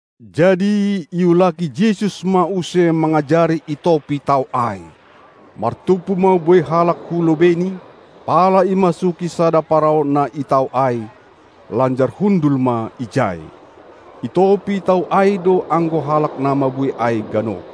Jadi iulaki Jesus ma use mangajari i topi tao ai. Martumpu ma buei halak hu lobeiNi, pala imasuki sada parau na i tao ai, lanjar hundul ma ijai. I topi tao ai do anggo halak na mabuei ai ganup.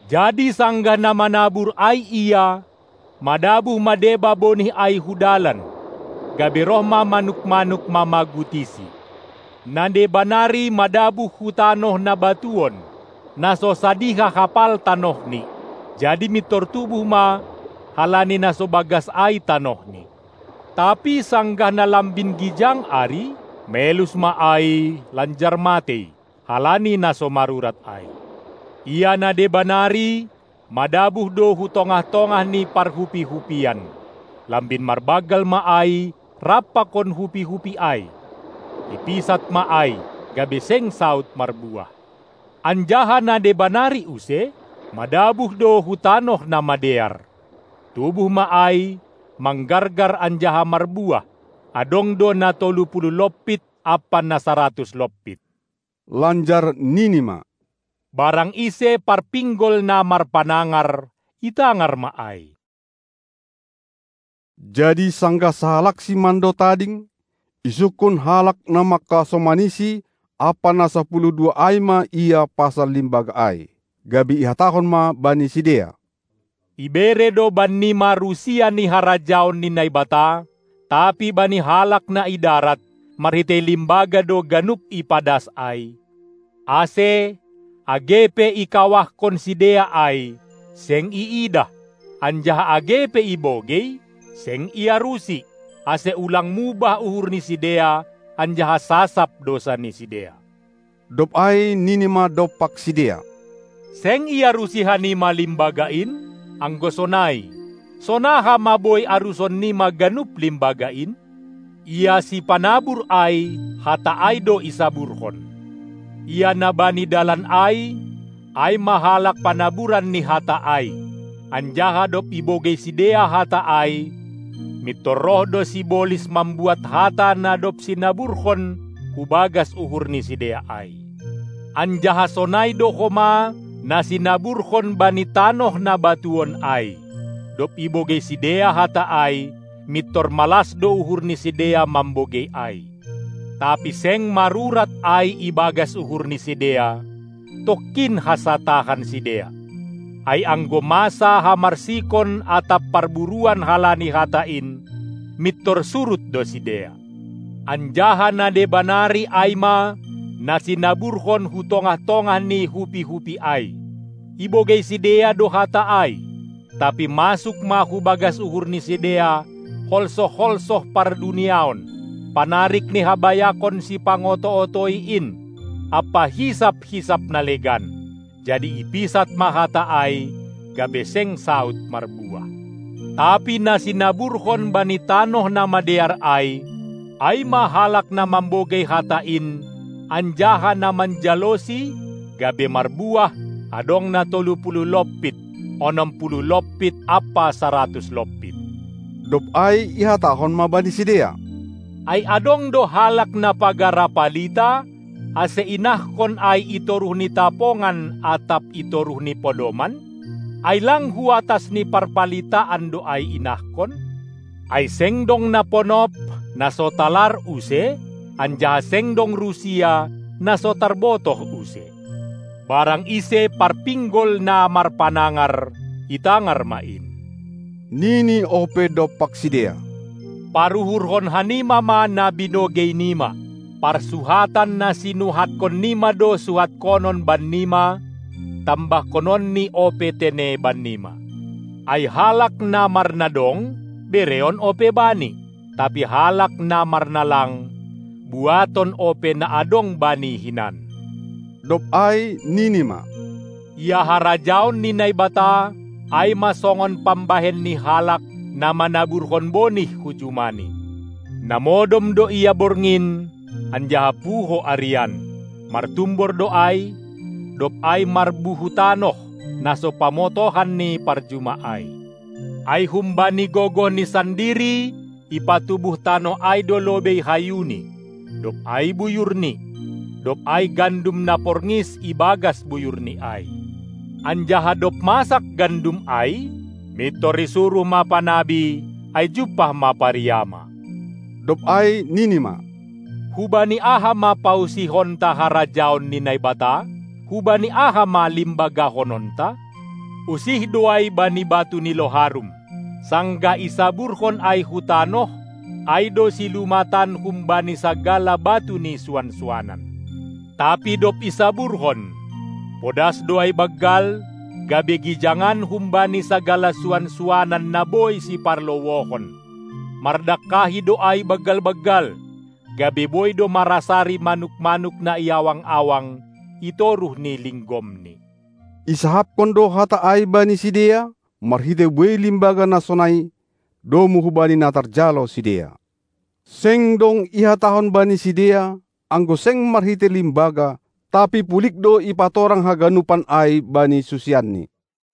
Jadi sanggah na manabur ai ia, madabuh ma deba bonih ai hu dalan, gabe roh ma manuk-manuk mamagutisi. Na deba nari madabuh hu tanoh na batuon, na so sadiha hapal tanohni, jadi mintor tubuh ma, halani na so bagas ai tanohni. Tapi sanggah na lambin gijang ari, melus ma ai lanjar matei, halani na so marurat ai. Ia na deba nari madabuh do hu tongah-tongah ni parhupi-hupian; lambin marbanggal ma ai rap pakon hupi-hupi ai; ipisat ma ai, gabe seng saud marbuah. Anjaha na deba nari use, madabuh do hu tanoh na madear; tubuh ma ai, manggargar anjaha marbuah, adong do na tolu puluh lompit ampa na saratus lompit. Lanjar nini ma: Barang ise parpinggol na marpanangar, itangar ma ai! Jadi sanggah sahalakSi mando tading, isungkun halak na mangkasomaniSi ampa na sapuluh dua ai ma Ia pasal limbaga ai. Gabe ihatahon ma bani sidea: Ibere do bannima rusia ni harajaon ni Naibata, tapi bani halak na i darat, marhitei limbaga do ganup ipadas ai, ase, age pe ikawahkon sidea ai, seng iidah, anjaha age pe ibogei, seng iarusi, ase ulang mubah uhur ni sidea anjaha sasap dousa ni sidea. Dob ai nini ma dompak sidea: Seng iarusi hanima limbaga in? Anggo sonai, sonaha ma boi arusan nima ganup limbaga in? Ia sipanabur ai, hata ai do isaburhon. Ia na bani dalan ai, ai ma halak panaburan ni hata ai; anjaha dob ibogei sidea hata ai, mintor roh do sibolis mambuat hata na dob sinaburhon hu bagas uhur ni sidea ai. Anjaha sonai do homa na sinaburhon bani tanoh na batuon ai, dob ibogei sidea hata ai, mintor malas do uhur ni sidea mambogei ai; tapi seng marurat ai i bagas uhur ni sidea, tongkin hansa tahan sidea. Ai anggo masa hamarsikon atap parburuon halani hata in, mintor surut do sidea. Anjaha na deba nari ai ma na sinaburhon hu tongah-tongah ni hupi-hupi ai. Ibogei sidea do hata ai, tapi masuk ma hu bagas uhur ni sidea holsoh-holsoh parduniaon, panarik ni habayakon sipangoto-otoi in, ampa hisap-hisap na legan, jadi ipisat ma hata ai, gabe seng saud marbuah. Tapi na sinaburhon bani tanoh na madear ai, ai ma halak na mambogei hata in anjaha na manjalosi, gabe marbuah, adong na tolu puluh lompit, onom puluh lompit ampa saratus lompit. Dob ai ihatahon ma bani sidea: Ai adong do halak na pagara palita, ase inahkon ai i toruh ni tapongan atap i toruh ni podoman? Ai lang hu atas ni parpalitaan do ai inahkon? Ai seng dong na ponop, na so talar use, anjaha seng dong rusia, na so tarbotoh use. Barang ise parpinggol na marpanangar, itangar ma in! Nini ope dompak sidea: Paruhurhon hanima ma na binogei nima! Parsuhatan na sinuhatkon nima do suhatkonon bannima, tambahkononNi ope tene bannima. Ai halak na marnadong, bereon ope bani, tapi halak na marnalang, buaton ope na adong bani hinan. Dob ai nini ma: Ia harajaon ni Naibata, ai ma songon pambahen ni halak, na manaburhon bonih hu jumani. Na modom do ia borngin, anjaha puho arian. Martumbor do ai, dob ai marbuhutanoh, na so pamotohan ni parjuma ai. Ai humbani gogohni sandiri ipatubuh tanoh ai do lobei hayuni, dob ai buyurni, dob ai gandum na porngis i bagas buyurni ai. Anjaha dob masak gandum ai, mintor isuruh ma panabi, ai jumpah ma pariama. Dob ai nini ma: Hubani aha ma pausihonta harajaon ni Naibata? Hubani aha ma limbagahononta? Usih do ai bani batu ni loharum. Sanggah isaburhon ai hu tanoh, ai do silumatan humbani sagala batu ni suan-suanan. Tapi dob isaburhon, podas do ai banggal, gabe gijangan humbani sagala suan-suanan na boi siparlowohon; mardangkahi do ai banggal-banggal, gabe boi do marasari manuk-manuk na i awang-awang i toruh ni linggomni. Isahapkon do hata ai bani sidea, marhitei buei limbaga na sonai, domu hubani na tarjalo sidea. Seng dong ihatahon bani sidea, anggo seng marhitei limbaga; tapi pulig do ipatorang haganupan ai bani susianNi.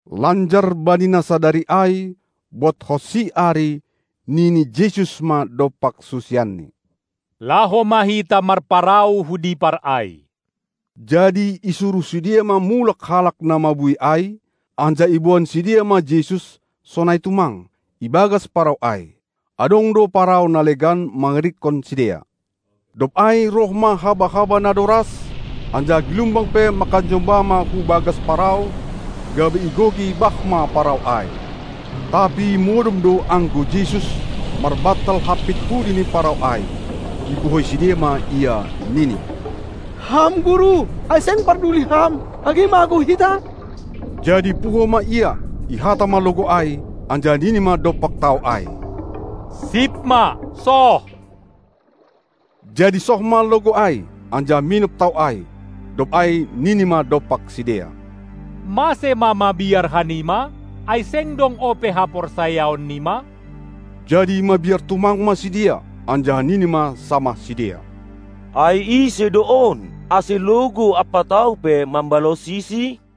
Lanjar bani na sadari ai, bodhonsi ari, nini Jesus ma dompak susianNi: Laho ma hita marparau hu dipar ai! Jadi isuruh sidea ma mulak halak na mabuei ai, anjaha iboan sidea ma Jesus, sonai tumang, ibagas parau ai. Adong do parau na legan mangirikkon sidea. Dob ai roh ma haba-haba na doras, anjaha gilumbang pe mangkajomba ma hu bagas parau, gabe igoki bah ma parau ai. Tapi modom do anggo Jesus, marbantal, hampit pudi ni parau ai. Ipuhoi sidea ma Ia, nini: Ham Guru! Ai seng parduli Ham, age magou hita? Jadi puho ma Ia, ihata ma logou ai, anjaha nini ma dompak tao ai: Sip ma! Soh! Jadi soh ma logou ai, anjaha minop tao ai. Dob ai nini ma dompak sidea: Mase ma mabiar hanima? Ai seng dong ope haporsayaon nima? Jadi mabiar tumang ma sidea, anjaha nini ma samah sidea: Ai ise do on, ase logou ampa tao pe mambalosiSi?